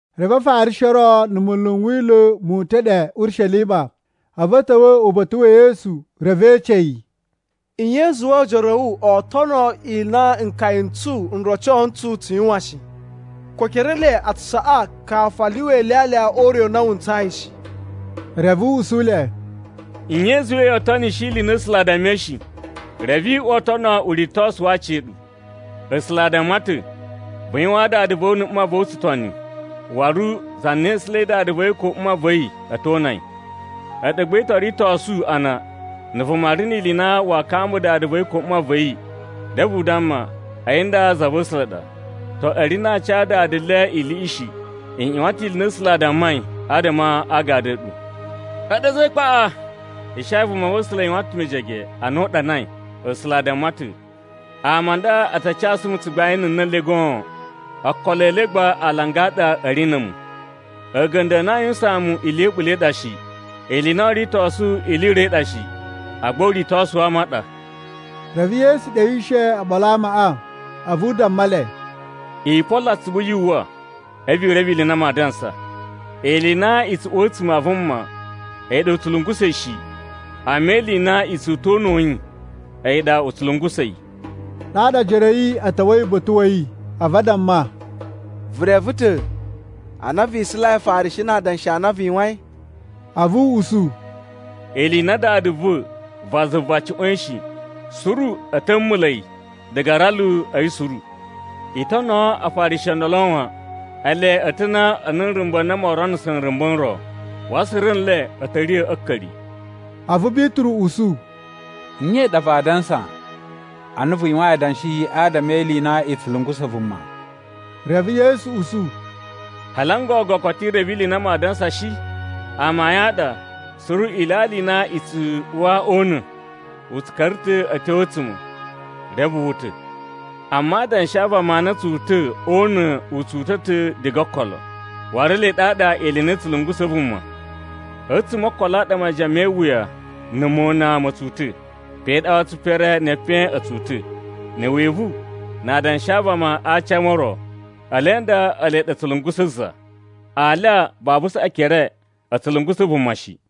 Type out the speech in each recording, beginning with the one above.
Reve Afarishi o ro na̱ munlu n Wila̱ mu uta̱ ɗe Urishelima, a̱vu a̱ ta̱wa̱ uba̱ta̱ wa̱ Yesu reve e ece yi, “Nye i zuwai ojoro a̱ wu oo tono ili i na nkaya n tsu n roco ntsu tsu yuwan shi? Ko ekere e le a tsu saꞌa kafu a lyuwa ilyalya o ure u na wu ntsayi shi.” Reve u usu le, “Nye i zuwai yoo tonishi ili i na A̱sula̱ a dammai shi, reve i uwa o tono uritosu wa aciya̱ɗu? A̱sula̱ a damma ta̱, ‘Vu yuwaan dada va̱ wu na̱ mma va̱ wu tsutoni,’ waru, ‘Za na isulai dada va̱ yi ko mma va̱ yi, a̱ to una yi.’ A̱ɗu gba i to ritosu a na na̱ vuma ri ni ili i na waa kambaa dada va̱ yi ko mma va̱ yi, reve u damma ‘A̱yi nda za va̱ A̱sula̱ ɗa,’ to, a̱ ri na a ca dada le iliꞌi shi. I ꞌyuwan ta̱ ili i na A̱sula̱ a dammai adama a agadu a̱ ɗu. A̱ɗu a̱za̱ e ikpaꞌa! Ishaya vumava̱sula̱ yuwan ta̱ mejege ana u ɗanai A̱sula̱ a damma ta̱: ‘Ama a nda a ta casu mu tsugbain a̱ na̱ le goon, okolo e le gba alanga a ɗa a̱ ri na̱ a̱mu. A̱ga̱nda̱ a na aa yuwusaan mu ili ya̱ a̱ɓula̱ i ɗa shi. Ili i na oo ritosu ili i ro i ɗa shi, agba uritosu wa ama u ɗa.’” Reve Yesu ɗewishe oɓolo a amaꞌa, a̱vu u damma le, “I polo atsuvu yu uwwa, a̱vu i reve ili i maa dansa. Ili i na i tsu uwa a̱tsuma̱ a vuma, a̱yi ɗa u tsu lungusa̱ yi shi. Amma ili i na i tsu uta̱ o una̱ wa̱ yi, a̱yi ɗa u tsu lungusa̱ yi.” Ɗaɗa ojoro a̱ yi a̱ ta̱wa̱i uba̱ta̱ wa̱ yi, a̱vu a damma, “Vu reve ta̱ a na vi isulai Afarishi na adanshi a na vu yuwain?” A̱vu u usu, “Ili i na Dada va̱ va zuva cuꞌwa̱in shi, suru a̱ ta̱ mula̱ yi diga a aralu a̱ yi suru. I tonoo Afarishi o ndolo wan! Ele a̱ ta̱ ana nrumba̱ n na moo ronuso nrumba̱ n ro, waru suru nle a̱ ta̱ riya̱ a̱ a̱a̱ka̱ri.” A̱vu Bituru usu, “Nye ɗa vaa dansa ana vu yuwain adanshi adama e ili i na i tsu lungusa̱ vuma?” Reve Yesu usu, “Hali n gogo koto vu reve ili i maa dansa shi? Amayun a ɗa, suru ilyalya i na i tsu uwa o una̱, u tsu ka̱ra̱ ta̱ a̱ tyo a̱ a̱a̱tsuma̱, reve wu uta̱. Amma adanshi a vama a na a̱ tsu uta̱ o una̱ u tsu uta̱ ta̱ diga o okolo. Waru ele ɗaɗa ili i na i tsu lungusa̱ vuma. A̱tsuma̱ o okolo a ɗa majiyan me iwuya na̱ mona ma̱ tsu uta̱, pe ɗa waru tsipere ne epen a̱ tsu uta̱, na̱ wivu na adanshi a vama a aci a ama o ro. Ele nda ele ɗa a̱ tsu lungusa̱ za. Alya babu saꞌa ekere, u tsu lungusa̱ vuma shi.”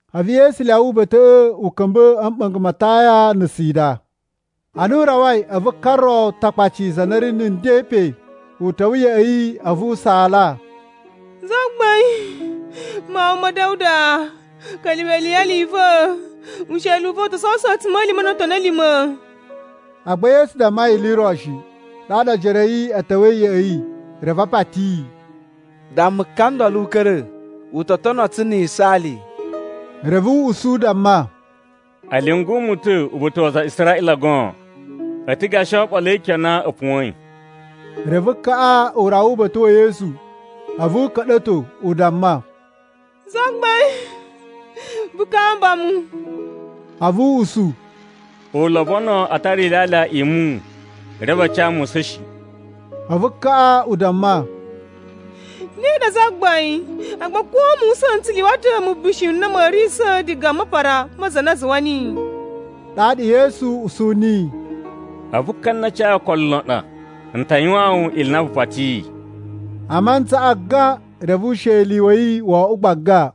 A̱vu Yesu lyawa uba̱ta̱ꞌa̱ u ka̱mba̱ a̱ mɓa̱nga̱ ma Taya na̱ Sida. Ana u rawai, a̱vu ka ro Takpaci za na ri na̱ nden pe, u ta̱wa̱ ya̱ꞌa̱ yi, a̱vu u saala, “Zagbain, Mawun ma̱ Da̱wuda, ka̱lyuwa̱ iliyali i va̱! Usheli u va̱ u to sowuso a̱tsuma̱lima̱ no otoni a̱ lima̱.” Agba Yesu damma yi ili i ro shi. Ɗaɗa ojoro a̱ yi a̱ ta̱wa̱i ya̱ꞌa̱ yi, reve a pati yi, “Damma ka ndolo u ka̱ra̱. U to tono tsu na̱ yisaali.” Reve u usu u damma, “A̱ lyungu mu ta̱ uba̱ta̱ wa aza a Israꞌila goon! A̱ ta̱ gashi oɓolo e ikyon a na a̱ puwa̱in.” Reve kaꞌa u rawa uba̱ta̱ wa̱ Yesu, a̱vu u ka̱ɗa̱to u damma, “Zagbain, vu kamba mu!” A̱vu u usu, “U lobono a tara ilyalya i muwun, reve a ca musa̱n shi.” A̱vu kaꞌa u damma, “Ne ɗa, Zagbain, agba ko musa̱n n tsu lyuwa ta̱ mubishi n na ma̱a̱ riyisa̱ diga a mapara ma za na zuwa niyi.” Ɗaɗa Yesu usu niyi, “A̱vu ka na cayi okolo lon ɗa! N ta yuwaan wu ili i na vu patiyi.” A mantsaꞌa gan, reve usheli wa̱ yi wo oꞌwo gbaga.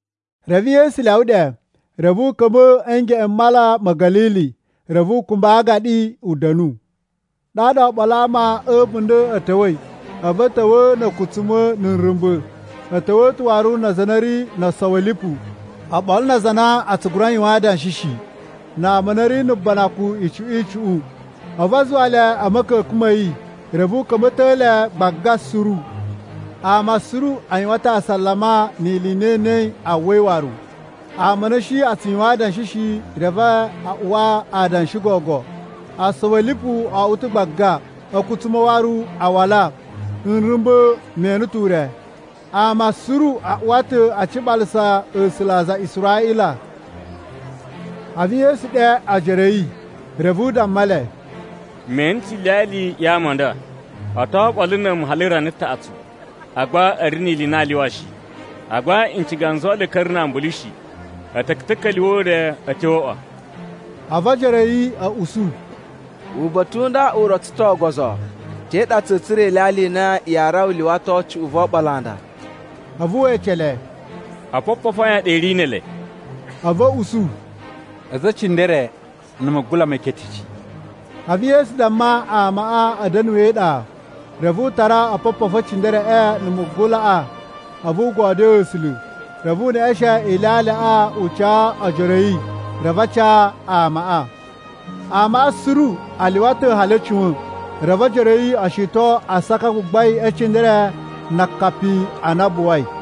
Reve Yesu lyawa ɗe, reve u ka̱mba̱ a̱ ngeꞌen m Mala ma̱ Ga̱lili. Reve u kumba a aagaɗi u da̱nu. Ɗaɗa oɓolo a ama a̱ a̱bunda̱ a̱ ta̱wa̱i, a̱vu a̱ ta̱wa̱a̱ na̱ a̱kutsuma̱ na̱ nrumba̱, a̱ ta̱wa̱ ta̱ waru na aza a na a̱ ri no osowi a̱ lipu, oɓolo na aza a na a tsu gura yuwan adanshi shi, na ama a na a̱ ri na̱ banakun icuꞌun icuꞌun. A̱vu a zuwa le a̱ ma̱ka̱ka̱n ma̱ yi, reve u ka̱mba̱to le gbaga suru. Ama suru a yuwan ta̱ asalama ni ili i na e enei a uwai waru. Ama a na a̱ shi a tsu yuwan adanshi shi, reve a uwa adanshi gogo. Osowi a̱ lipu o oꞌwo ta̱ gbaga, a̱kutsuma̱ waru a wala, nrumba̱ waru me ene ure. Ama suru a uwa ta̱ a ciɓalasa A̱sula̱ a aza a Israꞌila. A̱vu Yesu ɗe ojoro a̱ yi, reve u damma le, “Me ene ta̱ iliyali ya ama a nda. O to oɓolo na̱ a̱mu hali rana taꞌatsu, agba a̱ ri ni ili i na aa lyuwa shi. Agba n ciga n zuwa a̱ ka̱ra̱ na ambulu shi. A̱ ta̱ ta̱ka̱lyuwa̱ o ure a̱ tyo o uꞌwa.” A̱vu ojoro a̱ yi a̱ usu, “Uba̱ta̱ u nda u rotso ta̱ ogozo. Te ɗa tsa̱a̱ tsura̱ ilyalya i na yaa rawa lyuwato cuꞌun vo oɓolo a nda?” A̱vu we ece le, “Opopofu a yan a ɗa i ri ne ele?” A̱vu a̱ usu, “A̱za̱ e cindere, na̱ mugula meketeci.” A̱vu Yesu damma amaꞌa a̱ da̱nu e iɗa. Reve u tara opopofu e cindereꞌe na̱ mugulaꞌa a̱vu u godyoo A̱sula̱. Reve u neꞌeshen ilyalyaꞌa u ca ojoro a̱ yi, reve a ca amaꞌa. Amaꞌa suru a lyuwa ta̱ hali a̱ cuwa̱n. Reve ojoro a̱ yi o shiton asaka a gbagbain e cindere na akapi a na a buwai.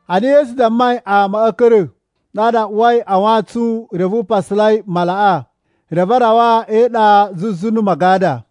Ana Yesu dammai amaꞌa a̱ ka̱ra̱, ɗaɗa u uwai a wantsun reve u pasalai malaꞌa. Reve a rawa e iɗa zuzu na̱ Magada.